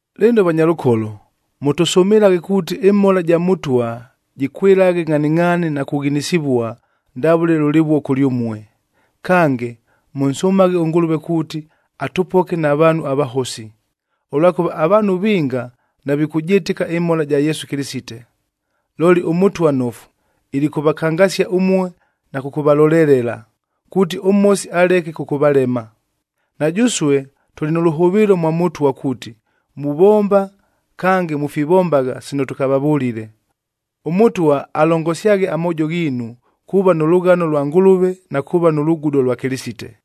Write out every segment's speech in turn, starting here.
Lɨno vanyalʉkolo, mʉtʉsʉmɨlaghe kuuti ɨmhola ja Mʉtwa, jɨkwɨlaghe ngʼhaningʼhaani na kughinisivua, ndavʉle lʉlɨvuo kʉlyʉmue. Kange, mʉnsʉmaghe ʉNgʉlʉve kuuti atʉpoke na vaanhu avahosi. Ʉlwakʉva avaanhu vinga navikʉjɨtɨka ɨmhola ja Yesu Kɨlɨsite. Looli ʉMʉtwa nnofu, ilikʉvakangasia ʉmue na kʉkʉvalolelela, kuuti ʉMhosi aleke kʉkʉvalema. Na jʉsue tʉlɨ nʉ lʉhʉvɨɨlo mwa Mʉtwa kuuti, muvomba kange mufivombagha sino tʉkavavʉlile. ɄMʉtwa alongosyaghe amoojo ghiinu, kuuva nʉ lʉghano lwa Ngʉlʉve na kuuva nʉ lugudo lwa Kɨlɨsite.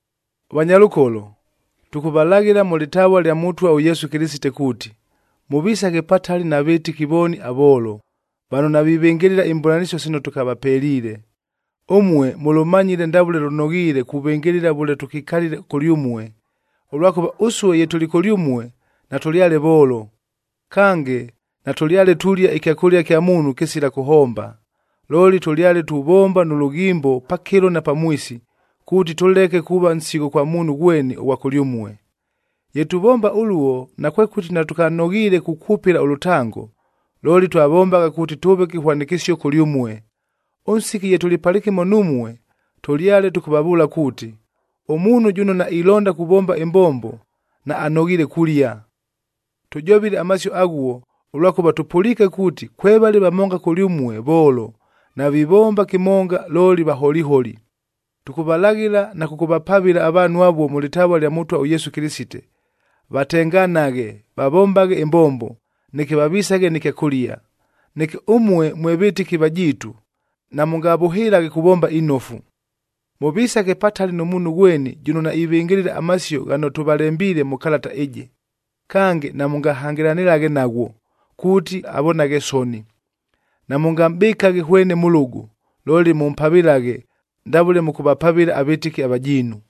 Vanyalʉkolo, tʉkʉvalaghɨla mʉ lɨtavua lya Mʉtwa ʉYesu Kɨlɨsite kuuti, mʉvisaghe patali na vɨtɨki vooni avoolo, vano navivɨngɨlɨla imbʉlanɨsio sino tʉkavapeliile. Ʉmue mʉlʉmanyile ndavʉle lʉnoghiile kuvɨngɨlɨla vʉle tʉkikalile kʉlyʉmue, ʉlwakʉva ʉsue ye tʉlɨ kʉlyʉmue, natʉlyale voolo. Kange, natʉlyale tulia ɨkyakʉlia kya muunhu kɨsila kʉhomba. Looli tʉlyale tuvomba nʉ lʉghimbo pakɨlo na pamwisi, kuuti tʉleke kuuva nsigho kwa muunhu ghweni ʉghwa kʉlyʉmue. Ye tuvomba ʉluo, nakwekʉti natʉkanoghiile kukwʉpɨla ʉlʉtango, looli twavombagha kuuti tʉʉve kɨhwanɨkɨsio kʉlyʉmue. Ʉnsiki ye tʉlɨ palɨkɨmo numue, tʉlyale tʉkʉvavʉʉla kuuti, “Ʉmuunhu jʉno nailonda kuvomba ɨmbombo, naanoghiile kulia.” Tʉjovile amasio aghuo, ʉlwakʉva tʉpʉliike kuuti, kwevale vamonga kʉlyʉmue voolo, navivomba kɨmonga, looli vaholiholi. Tʉkʉvalaghɨla na kʉkʉvapavɨla avaanhu avuo mʉ lɨtavua lya Mʉtwa ʉYesu Kɨlɨsite, vatenganaghe, vavombaghe ɨmbombo, neke vavisaghe nɨ kyakʉlia. Neke ʉmue mwe vɨtɨki vajiitu, namʉngavʉhɨlaghe kuvomba inofu. Mʉvisaghe patali nʉ muunhu ghweni jʉno naivɨngɨlɨla amasio ghano tʉvalembiile mʉ kalata ɨjɨ. Kange, namʉngahangɨlanɨlaghe naghwo, kuuti avonaghe soni. Namʉngamʼbɨkaghe hwene mʉlʉgʉ, looli mʉmpavɨlaghe ndavʉle mʉkʉvapavɨla avɨtɨki avajiinu.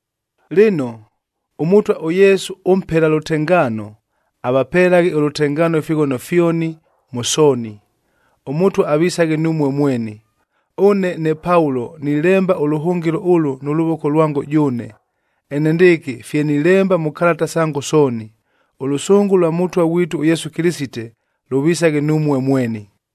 Lɨno, ʉMʉtwa ʉYesu ʉmpela lʉtengaano, avapelaghe ʉlʉtengaano ifighono fyoni, mʉ sooni. ɄMʉtwa avisaghe numue mweni. Ʉne ne Paulo nilemba ʉlʉhʉngɨlo ʉlʉ nʉ lʉvoko lwango jʉʉne, enendɨɨkɨ fye nilemba mʉ kalata sango sooni. Ʉlʉsʉngʉ lwa Mʉtwa ghwitu ʉYesu Kɨlɨsite, lʉvisaghe numue mweni.